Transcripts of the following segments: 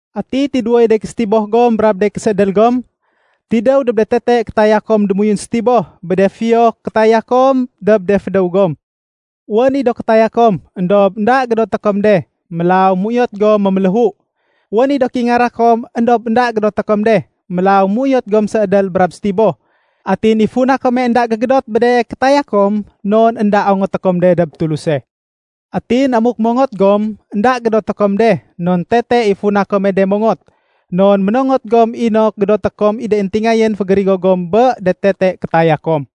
Ati tidéwoy de késétiboh gom brab de késéédél gom? Tidéw dob de tete kétaya kom démoyun sétiboh bé de fiyo kétaya kom dob de fédéw gom. Wén i do kétaya kom, éndob énda gédoté kom de. Mélaw méuyot gom méméléhu. Wén i do kéingara kom, éndob énda gédoté kom de. Mélaw méuyot gom séédél brab sétiboh. Atin i funa kome énda gégédot bé de kétaya kom, non énda ongoté kom de dob Tuluse. Atin amuk mongot gom, énda gédoté kom de, non tete i funa kom de mongot. Non ménongot gom inok gédoté kom i de éntingayén fégérigo gom bé de tete kétaya kom.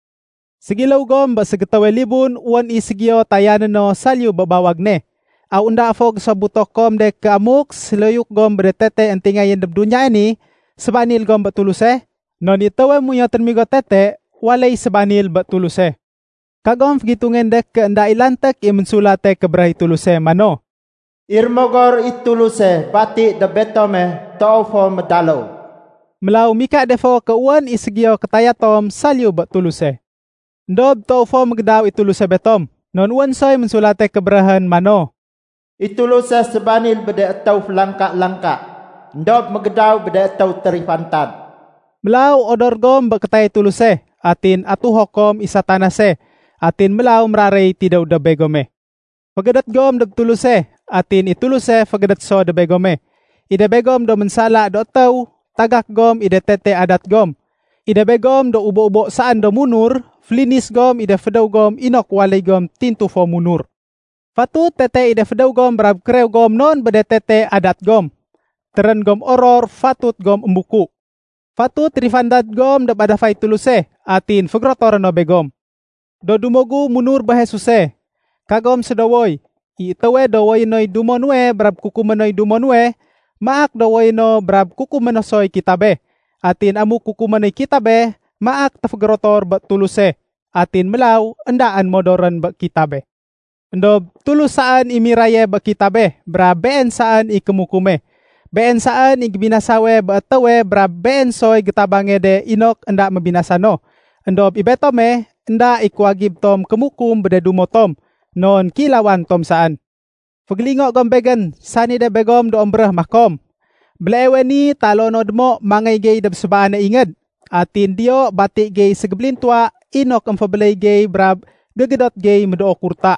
Ségiléw gom bé ségétéwe libun wén i ségiyo tayané no saliyu bé bawag ne. Aw énda fo gésobuto kom de ké amuk séloyuk gom bé de tete éntingayén dob duniyae ni, sébanil gom bé Tuluse? Non i étéwe méuyot rémigo tete, waléy sébanil bé Tuluse. Kagom fégitungén de ké énda i lanték i Ménsulate Kébéréh i Tuluse mano, “I Rémogor i Tuluse bati dob betome toow fo médaléw.” Mélaw mika de fo ké wén i ségiyo kétaya tom saliyu bé Tuluse. Endob toow fo mégédaw i Tuluse betom. Non wén soy Ménsulate Kébéréhén mano, “I Tuluse sébanil bé de étéw félangka-langka, éndob mégédaw bé de étéw térifantad.” Mélaw odor gom bé kétayay Tuluse. Atin atuho kom i Satanase, atin mélaw méraréy tidéw dob begome. Fégédét gom dob Tuluse, atin i Tuluse fégédét so dob begome. I de begom do ménsala do étéw, tagak gom i de tete adat gom. I de begom do ubo-ubo saén do munur, félinis gom i de fédéw gom inok waléy gom tintu fo munur. Fatut tete i de fédéw gom brab kérew gom non bé de tete adat gom. Térén gom oror, fatut gom émbuku. Fatut térifantad gom dob adafay Tuluse, atin fégérotoré no begom. Do dumo gu munur bé Jesuse, kagom sédowoy. I étéwe dowoyé noy dumo nuwe brab kukumé noy dumo nuwe, maak dowoyé no brab kukumé no soy kitabe. Atin amuk kukumé noy kitabe, maak téfégérotor bé Tuluse, atin mélaw éndaén modorén bé kitabe. Endob Tulus saén i miraye bé kitabe brab Been saén i kémukume. Been saén i gébinasawe bé étéwe brab Been soy gétabange de inok énda mébinasa no. Endob i betome, énda i kuwagib tom kémukum bé de dumo tom, non kéilawan tom saén. Fégélingo gom begén, sani de begom do émbéréh makom, “Béleewe ni taloo no démo mangéy gey dob sébaane ingéd. Atin diyo bati gey ségébélintuwa inok émfébéléy gey brab gégédot gey médoo kurta.”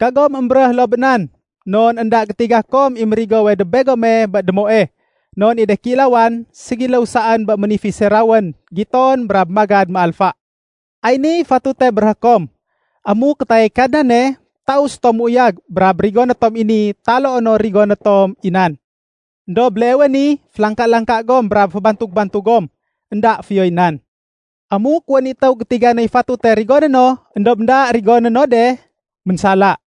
Kagom émbéréh loo bé nan. Non énda gétiga kom i mérigowe dob begome bé démoe. Non i de kéilawan, ségiléw saén bé ménifise rawén giton brab magad méalfa. Ay niy fatute béréhé kom, “Amuk kétayay Kadnane, taus tom méuyag brab rigoné tom i ni taloo no rigoné tom i nan.” Endob béleewe ni, félangka-langka gom brab fébantug-bantug gom. Enda fiyoy nan. Amuk wén i étéw gétiga noy fatute rigoné no, éndob énda rigoné no de, ménsala.